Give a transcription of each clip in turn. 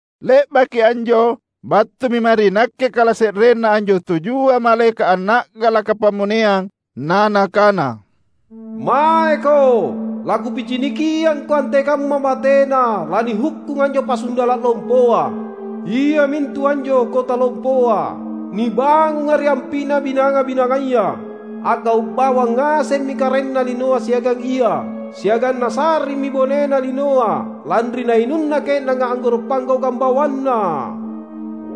Le’baki anjo battumi mae ri nakke kalase’renna anjo tujua malaeka’ anna’galaka pammoneang na nakana, "Maeko, lakupicinikiangko antekamma batena lanihukkung anjo pasundala’ lompoa, iamintu anjo kota lompoa, nibangunga ri ampi’na binanga-binangaya. A’gau’ bawang ngasemmi karaenna linoa siagang ia, siagang nasa’rimmi bonena linoa lanri nainunna ke’nanga anggoro’ panggaukang bawanna."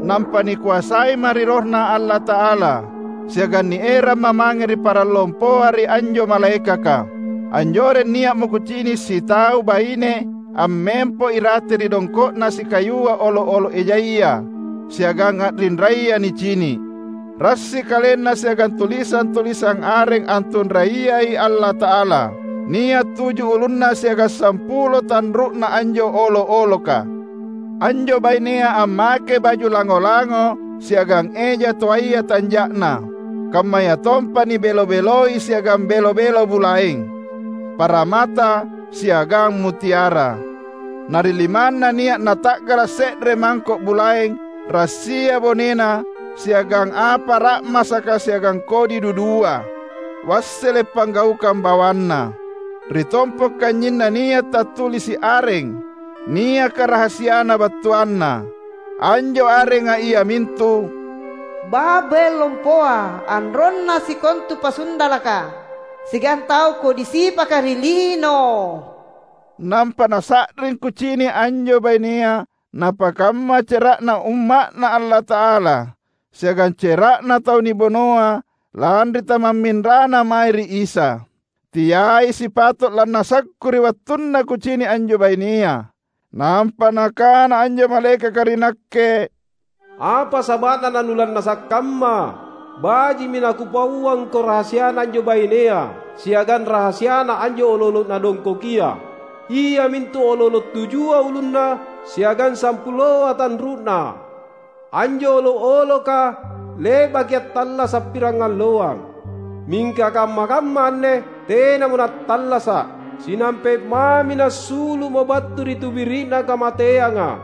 Nampa nikoasaima’ ri RohNa Allata’ala, siagang nieramma’ mange ri parang lompoa ri anjo malaekaka. Anjoreng nia’mo kucini’ sitau baine ammempo irate ri dongko’na sikayua olo’-olo’ ejaya siagang a’rinraya nicini’; rassi kalenna siagang tulisang-tulisang areng antunraiyai Allata’ala. Nia’ tuju ulunna siagang sampulo tanru’na anjo olo’-oloka. Anjo bainea ammakei baju lango-lango siagang eja toaya tanja’na, kammayatompa nibelo-beloi siagang belo-belo bulaeng, paramata, siagang mutiara. Na ri limanna nia’ nata’gala’ se’re mangko’ bulaeng rassia bonena siagang apa ra’masaka siagang kodi dudua, wassele’ panggaukang bawanna. Ri tompo’ kanynyinna nia’ tattulisi’ areng, niaka rahasiana battuanna. Anjo arenga iamintu "Babel Lompoa, anronna sikontu pasundalaka siagang tau kodi sipaka ri lino." Nampa nasa’ring kucini’ anjo bainea napakamma cera’na Umma’Na Allata’ala siagang cera’na tau nibunoa lanri tamamminrana mae ri Isa. Teai sipato’ lannasakku ri wattunna kucini’ anjo bainea. Nampa nakana anjo malaekaka ri nakke, "Apa saba’na nanulannasa’ kamma? Baji’mi nakupauangko rahasiana anjo bainea siagang rahasiana anjo olo’-olo’ nadongkokia, iamintu olo’-olo’ tujua ulunna siagang sampuloa tanru’na. Anjo olo’-oloka le’baki attallasa’ pirangalloang, mingka kamma-kamma anne tenamo nattallasa’. Sinampe’ mami nassulu’mo battu ri tubiri’na kamateanga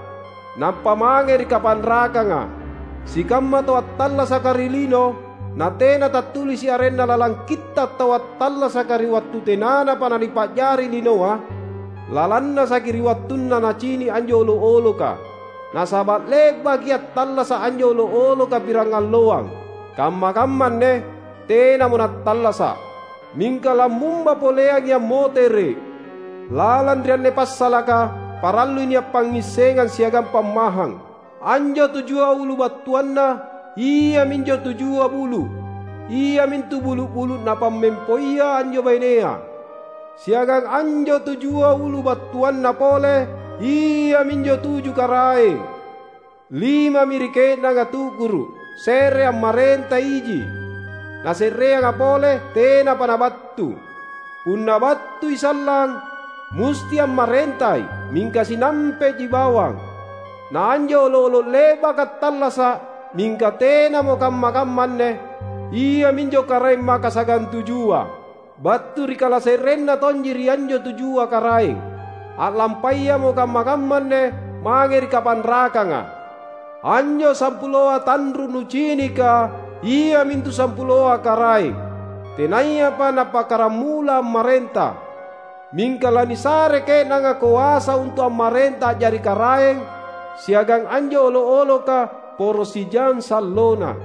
nampa mange ri kapanrakanga. Sikamma tau attallasaka ri lino, natena tattulisi’ arenna lalang Kitta’ Tau Attallasaka ri wattu tenanapa nanipa’jari linoa, lalannasaki ri wattunna nacini’ anjo olo’-oloka. Nasaba’ le’baki attallasa’ anjo olo’-oloka pirangalloang. Kamma-kamma anne tenamo nattallasa’, mingka lammumba poleangi ammotere’. Lalang ri anne passalaka parallui nia’ pangngissengang siagang pammahang. Anjo tujua ulu battuanna iaminjo tujua bulu’; iamintu bulu’-bulu’ napammempoia anjo bainea. Siagang anjo tujua ulu battuanna pole iaminjo tuju karaeng: limami ri ke’nanga tu’guru’, se’re ammarenta iji, na se’reanga pole tenapa nabattu. Punna battui sallang, musti ammarentai mingka sinampe’ji bawang. Na anjo olo’-olo’ le’baka attallasa’, mingka tenamo kamma-kamma anne, iaminjo karaeng makasagantujua. Battu ri kalase’renna tonji ri anjo tujua karaeng, a’lampayamo kamma-kamma anne mange ri kapanrakanga. Anjo sampuloa tanru’ nucinika iamintu sampuloa karaeng, tenayapa nappakkaramula ammarenta. Mingka lanisarei ke’nanga koasa untu’ ammarenta a’jari karaeng siagang anjo olo’-oloka poro sijang sallona.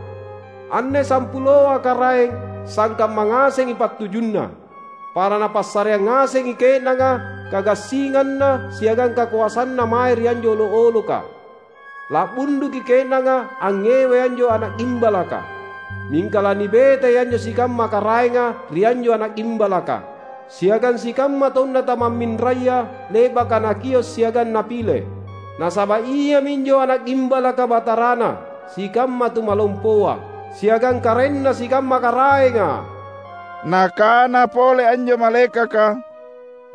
Anne sampuloa karaeng sangkamma ngasengi pattujunna; para napassareang ngasengi ke’nanga kagassinganna siagang kakoasanna mae ri anjo olo’-oloka. La’bunduki ke’nanga angngewai anjo Ana’ Gimbalaka. Mingka lanibetai anjo sikamma karaenga ri anjo Ana’ Gimbalaka siagang sikamma taunNa tamamminraya le’baka Nakio’ siagang Napile; nasaba’ Ia minjo Ana’ Gimbalaka Batarana sikamma tumalompoa, siagang Karaenna sikamma karaenga." Nakana pole anjo malaekaka,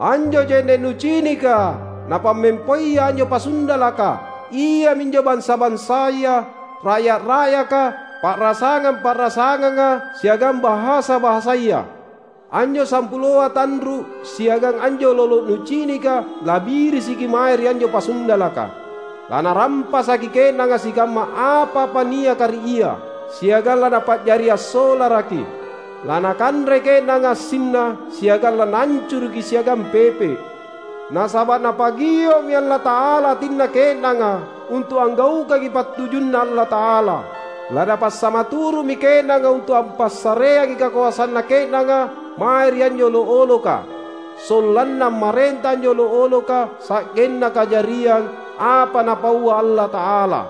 "Anjo je’ne’ nucinika, napammempoia anjo pasundalaka, iaminjo bansa-bansaya, ra’ya’-ra’yaka, pa’rasangang-pa’rasanganga siagang bahasa-bahasaya. Anjo sampuloa tanru’ siagang anjo olo’-olo’ nucinika labirisiki mae ri anjo pasundalaka. Lanarampasaki ke’nanga sikamma apa-apa niaka ri ia, siagang lanapa’jari assolaraki. Lanakanrei ke’nanga assinna siagang lanaancuruki siagang pepe’. Nasaba’ Napagio’mi Allata’ala atinna ke’nanga untu’ anggaukangi pattujunNa Allata’ala. LaNapassamaturu’mi ke’nanga untu’ ampassareangi kakoasanna ke’nanga mae ri anjo olo’-oloka sollanna ammarenta anjo olo’-oloka sa’genna kajariang apa Napaua Allata’ala.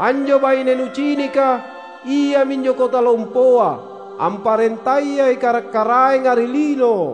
Anjo baine nucinika, iaminjo kota lompoa, amparentayai karaeng-karaenga ri lino."